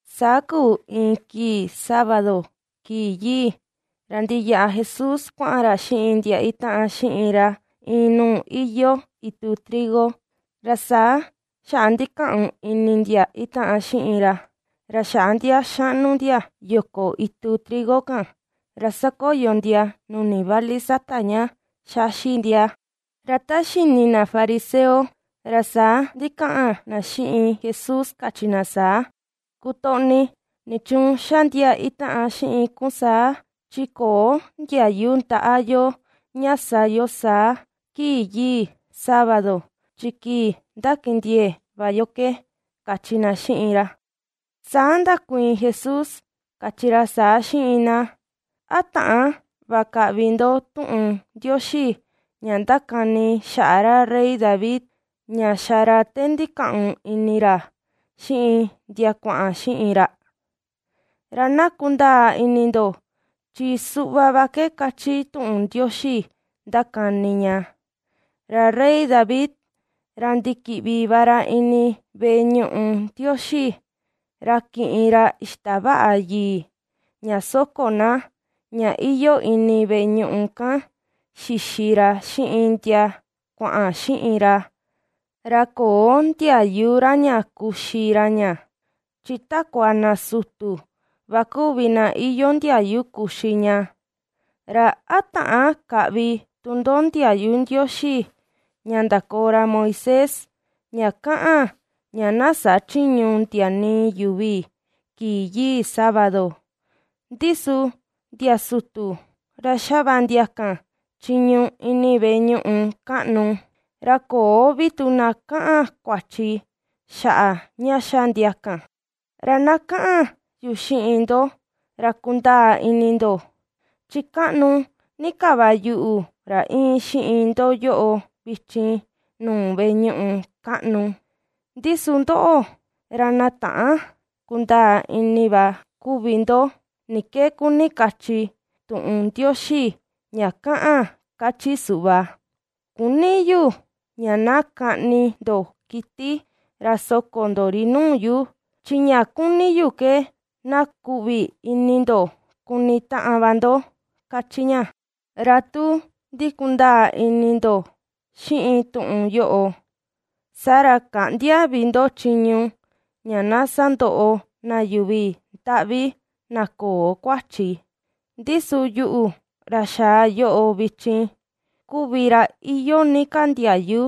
Saa kuu iin kii sábado, kii yii, ra ndiyaꞌa Jesús kuaꞌan ra xiꞌin ndia itaꞌan xiꞌin ra iin nuu iyoo itu trigo, ra saa xaꞌa ndikaꞌun ini ndia itaꞌan xiꞌin ra, ra xaꞌa ndia xaꞌnu ndia yoko itu trigo kan, ra ^sakoyo ndia nuni vali sata ña ^xaxi ndia. Ra ta xini ndia fariseo, ra saa ndikaꞌan ndia xiꞌin Jesús kachi na saa: ―Kutoꞌni, nichuun xa ndia itaꞌan xiꞌin kun saa: chi köo ndiayu ndaꞌa yo ña sa yo saa kii yii sábado, chi kii ndakindiee va yo ke ―kachi ndia xiꞌin ra. Saa ndakuiin Jesús kachi ra saa xiꞌin ndia: ―¿A täan va kaꞌvi ndo tuꞌun Ndioxi ña ndakani xaꞌa ra rey David, ña xa ra te ndikaꞌun ini ra xiꞌin ndia kuaꞌan xiꞌin ra? Ra na kundaa ini ndo chi suꞌva va ke kachi tuꞌun Ndioxi ndakani ña. Ra rey David, ra ndikiꞌvi va ra ini veꞌe ñuꞌu Ndioxi ra kiꞌin ra ixtavaꞌa yii, ña soko na, ña iyoo ini veꞌe ñuꞌu kan xixi ra xiꞌin ndia kuaꞌan xiꞌin ra, ra köo ndiayu ra ña kuxi ra ña, chi takua na sutu va kuvi na iyoo ndiayu kuxi ña. ¿Ra a täan kaꞌvi tu ndo ndiayu Ndioxi ña ndakoo ra Moisés, ña kaꞌan ña na sachïñu ndia nii yuvi kii yii sábado, ndi su ndia sutu ra xa va ndia kan chiñu ini veꞌe ñuꞌu kaꞌnu, ra köo vi tu na kaꞌan kuachi xaꞌa ña xa ndia kan? Ra na kaꞌan yu xiꞌin ndo ra kundaa ini ndo, chi kaꞌnu ni ka va yuꞌu ra íin xiꞌin ndo yoꞌo vichin nuu veꞌe ñuꞌu kaꞌnu. Ndi su ndoꞌo, ra na täan kundaa ini va kuvi ndo ni ke kuni kachi tuꞌun Ndioxi ña kaꞌan kachi suꞌva: “Küni yu ña na kaꞌni ndo kiti ra soko ndo ri nuu yu, chi ña kuni yu ke na kuꞌvi ni ini ndo kuni taꞌan va ndo”, kachi ña. Ra tu ndikundaa ini ndo xiꞌin tuꞌun yoꞌo, saa ra käꞌndia vi ndo chiñu ña na sandoꞌo na yuvi ndaꞌvi na köo kuachi. Ndi su, yuꞌu ra xaa yoꞌo vichin, kuvi ra iyoo ni ka ndiayu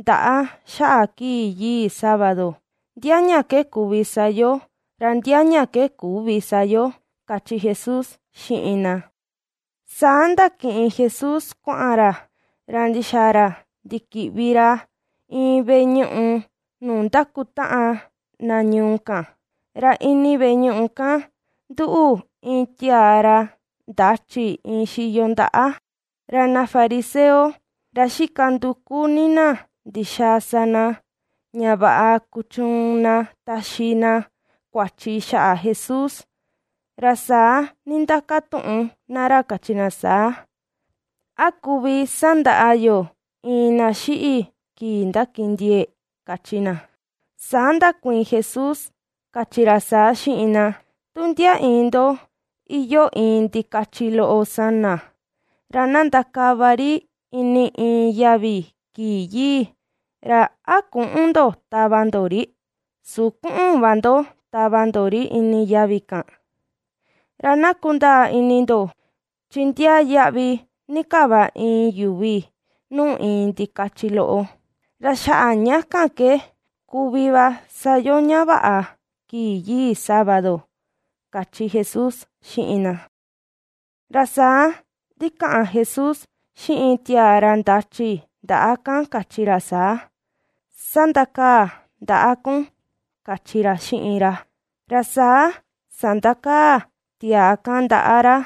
ndaꞌa xaꞌa kii yii sábado, ndia ña ke kuvi sa yo, ra ndia ña ke küvi sa yo ―kachi Jesús xiꞌin ndia. Saa ndakiꞌin Jesús kuaꞌan ra, ra ndixaa ra ndikiꞌvi ra iin veꞌe ñuꞌu nuu ndakutaꞌan na ñuu kan. Ra ini veꞌe ñuꞌu kan nduꞌu iin tiaa ra ndachi iin xiyo ndaꞌa; ra ndia fariseo ra xika nduku ni ndia ndixaa sa ndia, ña vaꞌa kuchuun ndia taxi ndiaa kuachi xaꞌa Jesús, ra saa nindakatuꞌun ndia ra kachi ndia saa: ―¿A kuvi sandaꞌa yo iin na xiꞌi kii ndakindiee? ―kachi ndia. Saa ndakuiin Jesús kachi ra saa xiꞌin ndia: ―Tu ndia iin ndo iyoo iin ndikachi loꞌo sana, ra na ndakava ri ini iin yavi kii yii, ¿ra a küꞌun ndo tava ndo ri? ¿Su kuꞌun va ndo tava ndo ri ini yavi kan? Ra na kundaa ini ndo, chi ndiaa yaꞌvi ni ka va iin yuvi nuu iin ndikachi loꞌo; ra xaꞌa ña kan ke kuvi va sa yo ña vaꞌa kii yii sábado ―kachi Jesús xiꞌin ndia. Ra saa ndikaꞌan Jesús xiꞌin tiaa ra ndachi ndaꞌa kan kachi ra saa: ―Sandakaa ndaꞌa kun ―kachi ra xiꞌin ra. Ra saa sandakaa tiaa kan ndaꞌa ra,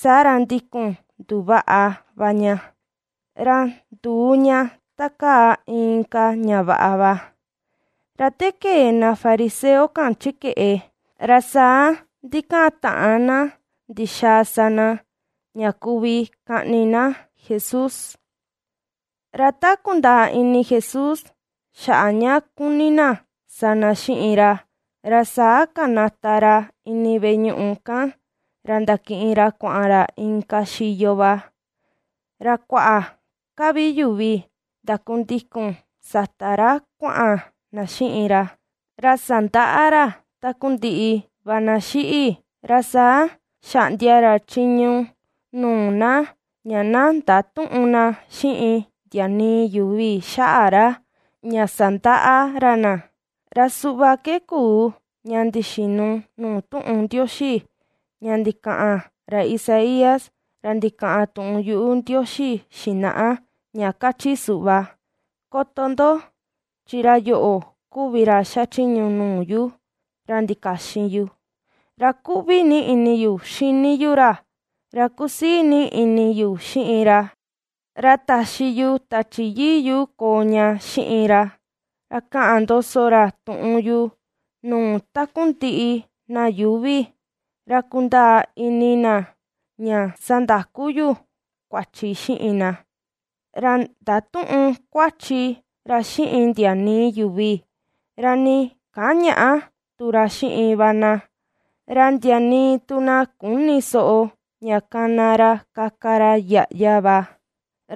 saa ra ndikun nduvaꞌa va ña, ra nduu ña ta kaa inka ña vaꞌa va. Ra te kee ndia fariseo kan chi keꞌe, ra saa ndikataꞌan ndia ndixaa sa ndia, ña kuvi kaꞌni na Jesús. Ra ta kundaa ini Jesús xaꞌa ña kuni ndia sa ndia xiꞌin ra, ra saa kanata ra ini veꞌe ñuꞌu kan ra ndakiꞌin ra kuaꞌan ra inka xiyo va, ra kuaꞌa ka vi yuvi ndakundikun sata ra kuaꞌan na xiꞌin ra. Ra sandaꞌa ra takundiꞌi va na xiꞌi. Ra saa xaꞌndia ra chiñu nuu na ña na ndatüꞌun na xiꞌin ndia nii yuvi xaꞌa ra, ña sandaꞌa ra na. Ra suꞌva ke kuu ña ndixinu nuu tuꞌun Ndioxi, ña ndikaꞌan ra Isaías ra ndikaꞌan tuꞌun yuꞌu Ndioxi xinaꞌa, ña kachi suꞌva: Koto ndo, chi ra yoꞌo kuvi ra xachiñu nuu yu, ra ndikaxin yu; ra kuꞌvi ni ini yu xini yu ra, ra kusii ni ini yu xiꞌin ra. Ra taxi yu Tachi Yii yu koo ña xiꞌin ra, ra kaꞌan ndoso ra tuꞌun yu nuu takundiꞌi na yuuvi, ra kundaa ini na ña sandaku yu kuachi xiꞌin na. Ra ndatüꞌun kuachi ra xiꞌin ndia nii yuvi, ra nii kañäꞌa tu ra xiꞌin va na; ra ndia nii tu na küni soꞌo ña kana ra kaka ra yaꞌya va.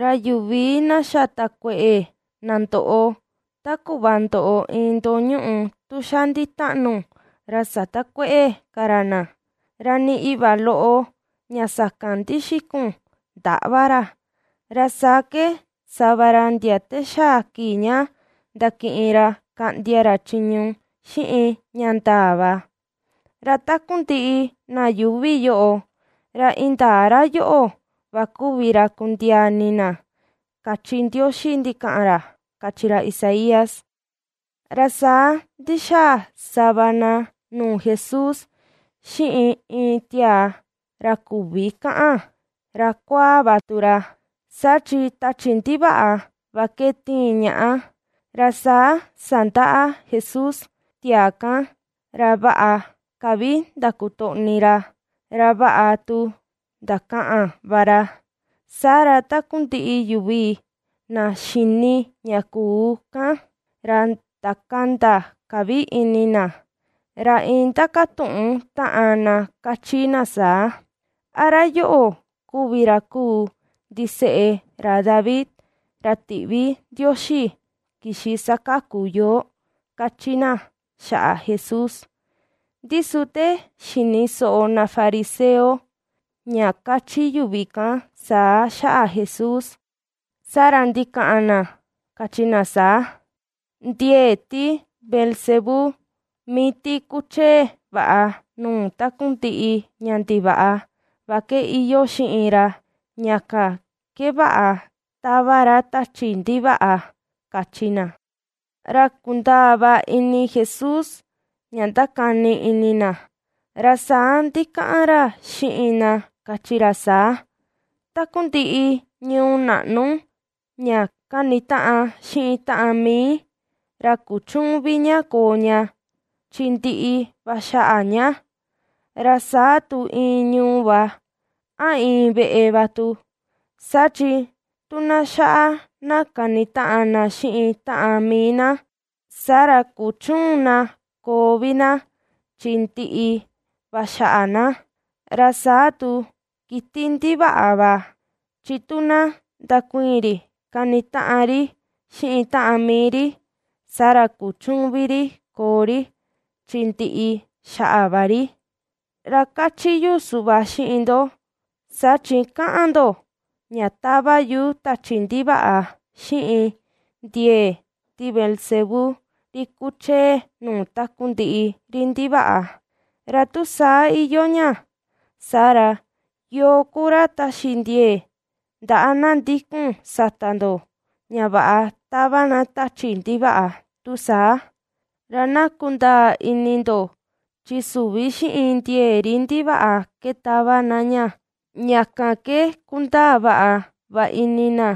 Ra yuvi na xa takueꞌe, na ndoꞌo, ta kuꞌva ndoꞌo iin ndoo ñuꞌu tun xa nditaꞌnu, ra satakuëꞌe ka ra na; ra nii iꞌva loꞌo ña sakan ndixikun, ndäꞌva ra, ra saa ke ^sa va ra ndia te xaa kii ña ndakiꞌin ra kaꞌndia ra chiñu xiꞌin ña ndaa va. Ra takundiꞌi na yuuvi yoꞌo, ra indaa ra yoꞌo va kuvi ra kundiaa ini na, kachi Ndioxi ndikaꞌan ra, kachi ra Isaías. Ra saa ndixaa sava na nuu Jesús xiꞌin iin tiaa ra küvi kaꞌan, ra kuaa va tu ra, saa chi tachi ndivaꞌa va ke tiin ñaꞌa, ra saa sandaꞌa Jesús tiaa kan ra vaꞌa ka vi ndakutoꞌni ra, ra vaꞌa tu ndakaꞌan va ra. Saa ra takundiꞌi yuvi na xini ña kuu kan, ra ndakanda ka vi ini na, ra iin ndakatuꞌun taꞌan na kachi na saa: ―¿A ra yoꞌo kuvi ra kuu ndiseꞌe ra David, ra tiꞌvi Ndioxi kixi sakaku yoo? ―kachi na xaꞌa Jesús. Ndi su te xini soꞌo ndia fariseo, ña kachi yuvi kan saa xaꞌa Jesús, saa ra ndikaꞌan ndia kachi ndia saa: ―Ndiee ti Beelzebú mii ti kuchee vaꞌa nuu takundiꞌi ña ndivaꞌa va ke iyoo xiꞌin ra, ña kan ke vaꞌa tava ra tachi ndivaꞌa ―kachi ndia. Ra kundaa va ini Jesús ña ndakani ini ndia, ra saa ndikaꞌan ra xiꞌin ndia kachi ra saa: ―Takundiꞌi ñuu naꞌnu ña kanitaꞌan xiꞌin taꞌan mii, ra kuchüun vi ña koo ña, chi ndiꞌi va xaꞌa ña; ra saa tu iin ñuu va, a iin veꞌe va tu, saa chi tu na xaꞌa na kanitaꞌan na xiꞌin taꞌan mii na, saa ra kuchüun na koo vi na chi ndiꞌi va xaꞌa na. Ra saa tu kiti ndivaꞌa va, chi tu na ndukuiin ri kanitaꞌan ri xiꞌin taꞌan mii ri; saa ra kuchüun vi ri koo ri, chi ndiꞌi xaꞌa va ri. Ra kachi yu suꞌva xiꞌin ndo, saa chi kaꞌan ndo, ña tava yu tachi ndivaꞌa xiꞌin ndiee ti Beelzebú, ri kuchee nuu takundiꞌi ri ndivaꞌa; ra tu saa iyoo ña, saa ra, ¿yoo ku ra taxi ndiee ndaꞌa na ndikun sata ndo ña vaꞌa tava na tachi ndivaꞌa tu saa? Ra na kundaa ini ndo chi süvi xiꞌin ndiee ri ndivaꞌa ke tava na ña. Ña kan ke kundaa vaꞌa va ini na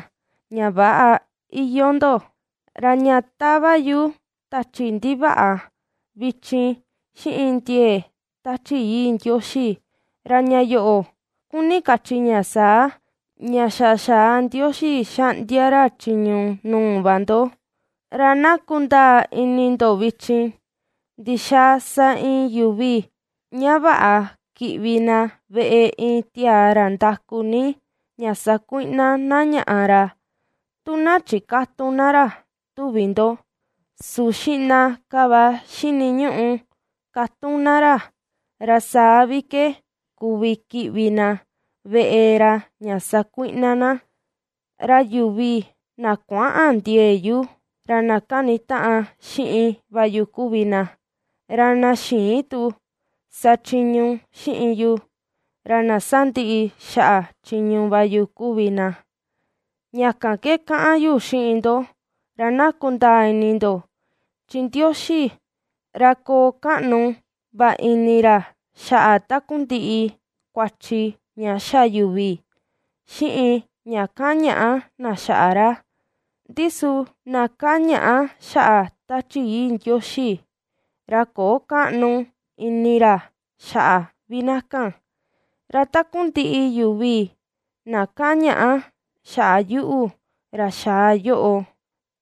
ña väꞌa iyoo ndo. Ra ña tava yu tachi ndivaꞌa vichin xiꞌin ndiee Tachi Yii Ndioxi, ra ña yoꞌo kuni kachi ña saa, ña xa xaa Ndioxi xaꞌndia ra chiñu nuu va ndo. ’Ra na kundaa ini ndo vichin: ¿Ndixaa sa iin yuvi ña vaꞌa kiꞌvi na veꞌe iin tiaa ra ndaku ni ña sakuiꞌna na ñaꞌa ra, tu na chikätun na ra, tuvi ndo? Su xiꞌna ka va xiniñuꞌu katun na ra, ra saa vi ke kuvi kiꞌvi na veꞌe ra ña sakuiꞌna na. ’Ra yuvi na kuäꞌan ndiee yu, ra na kanitaꞌan xiꞌin va yu kuvi na, ra na xïin tu sachiñu xiꞌin yu, ra na sandiꞌi xaꞌa chiñu va yu kuvi na. ’Ña kan ke kaꞌan yu xiꞌin ndo ra na kundaa ini ndo, chi Ndioxi ra koo kaꞌnu va ini ra xaꞌa takundiꞌi kuachi ña xa yuvi, xiꞌin ña kañaꞌa na xaꞌa ra, ndi su na kañaꞌa xaꞌa Tachi Yii Ndioxi, ra köo kaꞌnu ini ra xaꞌa vi na kan. Ra takundiꞌi yuvi na kañaꞌa xaꞌa yuꞌu ra xaa yoꞌo,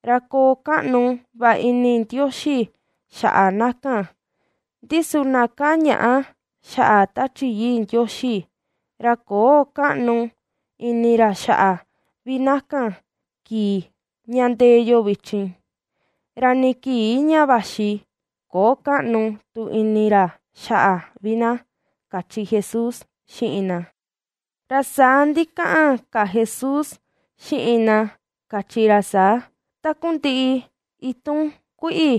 ra koo kaꞌnu va ini Ndioxi xaꞌa na kan, ndi su na kañaꞌa xaꞌa Tachi Yii Ndioxi, ra köo kaꞌnu ini ra xaꞌa vi na kan kii ña ndee yo vichin, ra nii kii ña vaxi köo kaꞌnu tu ini ra xaꞌa vi na ―kachi Jesús xiꞌin ndia. Ra saa ndikaꞌan ka Jesús xiꞌin ndia kachi ra saa: ―Takundiꞌi itun kuiꞌi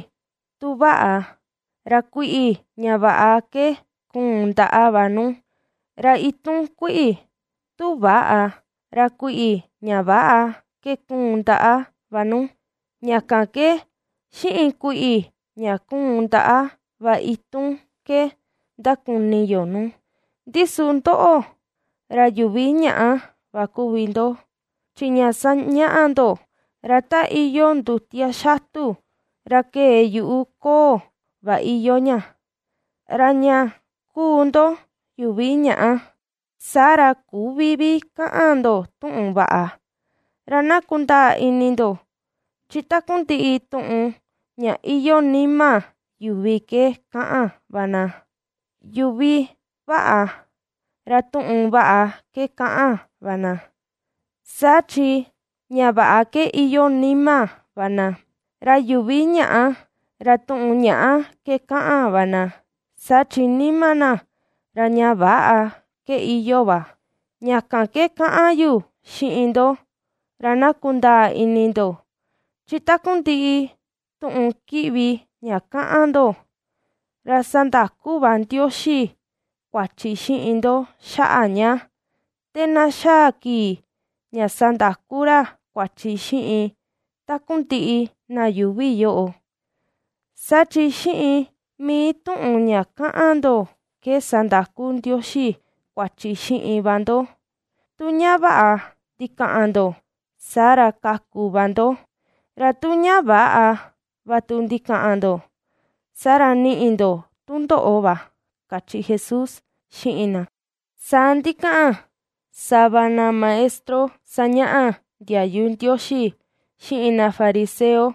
tu vaꞌa, ra kuiꞌi ña vaꞌa ke kuun ndaꞌa va nu; ra itun kuiꞌi tu väꞌa, ra kuiꞌi ña väꞌa ke kuun ndaꞌa va nu; ña kan ke xiꞌin kuiꞌi ña kuun ndaꞌa va itun ke ndakuni yo nu. Ndi su ndoꞌo, ra yuvi ñàꞌa va kuvi ndo, chi ña sañaꞌa ndo, ra ta iyoo ndutia xatu ra kee yuꞌu ko̱o̱ va iyoo ña. Ra ña kuu ndo yuvi ñaꞌa, saa ra küvi vi kaꞌan ndo tuꞌun vaꞌa. Ra na kundaa ini ndo, chi takundiꞌi tuꞌun ña iyoo nima yuvi ke kaꞌan va na. Yuvi vaꞌa, ra tuꞌun vaꞌa ke kaꞌan va na, saa chi ña vaꞌa ke iyoo nima va na, ra yuvi ñàꞌa, ra tuꞌun ñàꞌa ke kaꞌan va na, saa chi nima na, ra ña väꞌa ke iyoo va. Ña kan ke kaꞌan yu xiꞌin ndo, ra na kundaa ini ndo, chi takundiꞌi tuꞌun kiꞌvi ña kaꞌan ndo, ra sandaku va Ndioxi kuachi xiꞌin ndo xaꞌa ña, te na xaa kii ña sandaku ra kuachi xiꞌin takundiꞌi na yuuvi yoꞌo. Saa chi xiꞌin mii tuꞌun ña kaꞌan ndo ke sandaku Ndioxi kuachi xiꞌin va ndo: tu ña vaꞌa ndikaꞌan ndo, saa ra kaku va ndo, ra tu ña väꞌa va tu ndikaꞌan ndo, saa ra niꞌi ndo tundoꞌo va ―kachi Jesús xiꞌin na. Saa ndikaꞌan sava ndia maestro sañaꞌa ndiayu Ndioxi, xiꞌin ndia fariseo,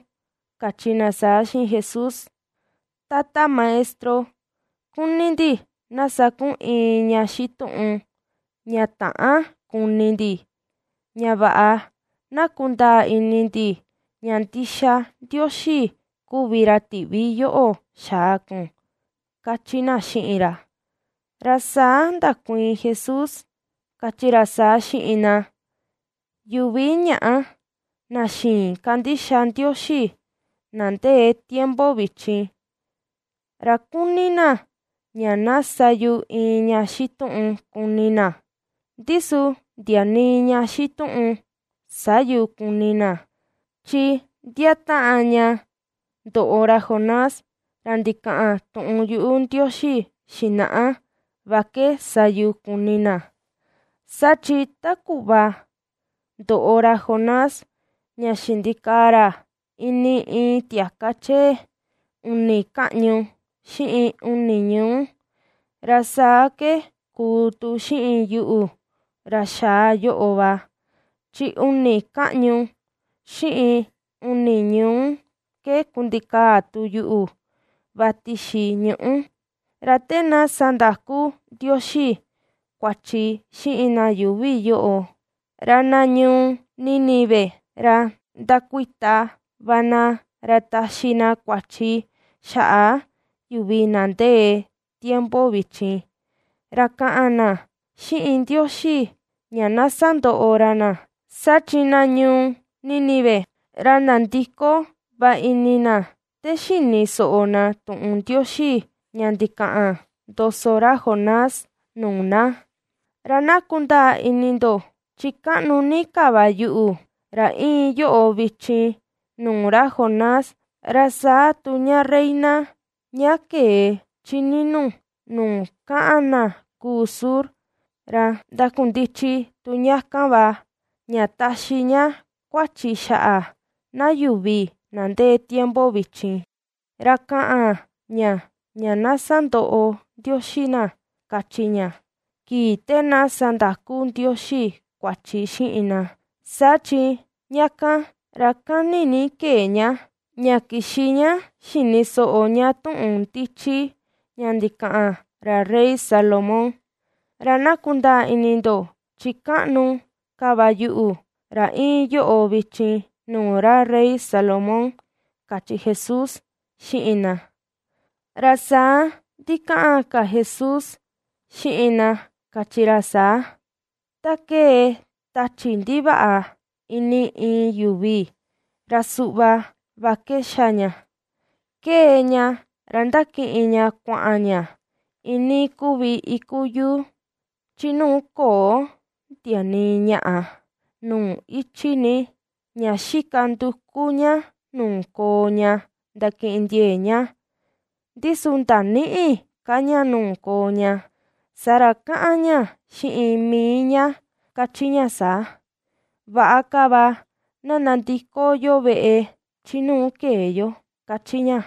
kachi ndia saa xiꞌin Jesús: ―Tata Maestro, kuni ndi na sa kun iin ña xituꞌun ña täan kuni ndi, ña vaꞌa na kundaa ini ndi ña ndixa Ndioxi kuvi ra tiꞌvi yoꞌo xaa kun ―kachi ndia xiꞌin ra. Ra saa ndakuiin Jesús kachi ra saa xiꞌin ndia: ―Yuvi ñàꞌa na xïin kandixa Ndioxi na ndee tiempo vichin, ra kuni na ña na sa yu iin ña xituꞌun kuni na, ndi su ndia nii ña xituꞌun sä yu kuni na, chi ndia taꞌan ña ndoꞌo ra Jonás, ra ndikaꞌan tuꞌun yuꞌu Ndioxi xinaꞌa va ke sa yu kuni na. Saa chi ta kuꞌva ndoꞌo ra Jonás, ña xindikaa ra ini iin tiaka chee uni kaꞌñu xiꞌin uni ñuu, ra saa ke kuu tu xiꞌin yuꞌu ra xaa yoꞌo va, chi uni kaꞌñu xiꞌin uni ñuu ke kundikaa tu yuꞌu va tixi ñuꞌú. Ra te na sandaku Ndioxi kuachi xiꞌin na yuuvi yoꞌo, ra na ñuu Nínive, ra ndakuita va na ra taxi na kuachi xaꞌa yuvi na ndee tiempo vichin, ra kaꞌan na xiꞌin Ndioxi ña na sandoꞌo ra na, saa chi na ñuu Nínive, ra nandiko va ini na te xini soꞌo na tuꞌun Ndioxi ña ndikaꞌan ndoso ra Jonás nuu na. Ra na kundaa ini ndo chi kaꞌnu ni ka va yuꞌu, ra iin yoꞌo vichin nuu ra Jonás. Ra saa tu ña reina ña kee chi ninu nuu kaꞌan na kuu sur, ra ndakundichi tu ña kan va, ña taxi ña kuachi xaꞌa na yuvi na ndee tiempo vichin, ra kaꞌan ña ña na sandoꞌo Ndioxi na, kachi ña, kii te na sandaku Ndioxi kuachi xiꞌin na, saa chi ña kan ra kani ni kee ña, ña kixi ña xini soꞌo ña tuꞌun ndichi ña ndikaꞌan ra rey Salomón. Ra na kundaa ini ndo chi kaꞌnu ka va yuꞌu, ra iin yoꞌo vichin nuu ra rey Salomón ―kachi Jesús xiꞌin ndia. Ra saa ndikaꞌan ka Jesús xiꞌin ndia, kachi ra saa: ―Ta kee tachi ndivaꞌa ini iin yuvi ra suꞌva va ke xa ña: ^kee ña ra ndakiꞌin ña kuaꞌan ña iinii kuvi iku yuu, chi nuu köo ndia nii ñaꞌa, nuu ichi ní, ña xika nduku ña nuu koo ña ndakindiee ña, ndi su ndanïꞌi ka ña nuu koo ña. Saa ra kaꞌan ña xiꞌin mii ña kachi ña saa: “Vaꞌa ka va na nandiko yo veꞌe chi nuu kee yo”, kachi ña.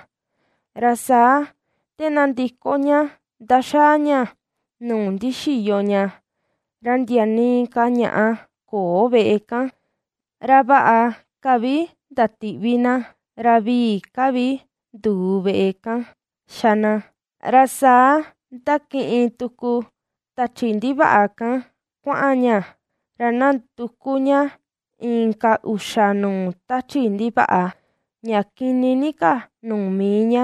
Ra saa te nandiko ña ndaxaa ña nuu ndixiyo ña, ra ndia nii ka ñaꞌa köo veꞌe kan, ra vaꞌa ka vi ndatiꞌvi na, ra vii ka vi nduu veꞌe kan xa na. Ra saa ^ndakiꞌin tuku tachi ndivaꞌa kan kuaꞌan ña, ra ^nanduku ña inka uxa nuu tachi ndivaꞌa, ña kini ni ka nuu mii ña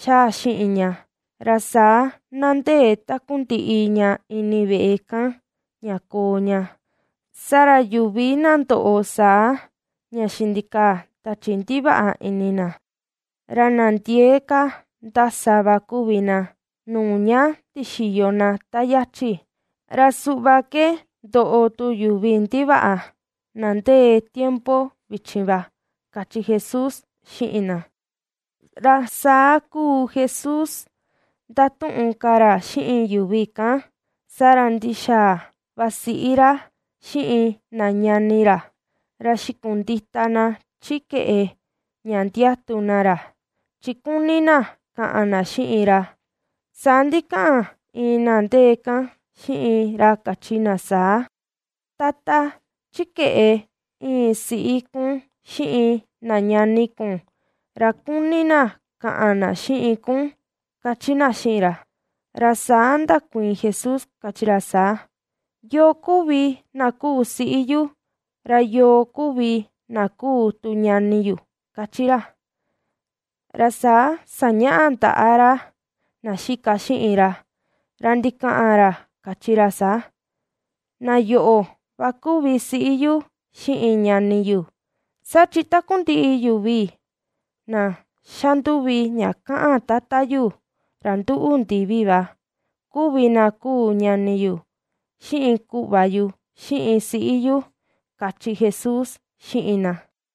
^xaa xiꞌin ña, ra saa ^nandee takundiꞌi ña ini veꞌe kan, ña koo ña. Saa ra yuvi na ndoꞌo saa ña xindikaa tachi ndivaꞌa ini na, ra na ndiee ka ndasa va kuvi na, nuu ña ndixiyo na ta yachi. Ra suꞌva ke ndoꞌo tu yuvi ndivaꞌa, na ndee tiempo vichin va ―kachi Jesús xiꞌin ndia. Ra saa kuu Jesús ndatuꞌun ka ra xiꞌin yuvi kan, saa ra ndixaa va siꞌi ra xiꞌin na ñani ra, ra xikundita na chi keꞌe ña ndiatu na ra, chi kuni na kaꞌan na xiꞌin ra. Saa ndikaꞌan iin na ndee kan xiꞌin ra kachi na saa: ―Tata, chi keꞌe íin siꞌi kun xiꞌin na ñani kun, ra kuni na kaꞌan na xiꞌin kun ―kachi na xiꞌin ra. Ra saa ndakuiin Jesús kachi ra saa: ―¿Yoo kuvi na kuu siꞌi yu, ra yoo kuvi na kuu tu ñani yu? ―kachi ra. Ra saa sañaꞌa ndaꞌa ra na xika xiꞌin ra, ra ndikaꞌan ra kachi ra saa: ―Na yoꞌo va kuvi siꞌi yu xiꞌin ñani yu. Saa chi takundiꞌi yuvi na xanduvi ña kaꞌan Tata yu, ra nduꞌu ndivi va, kuvi na kuu ñani yu, xiꞌin kuꞌva yu, xiꞌin siꞌi yu ―kachi Jesús xiꞌin na.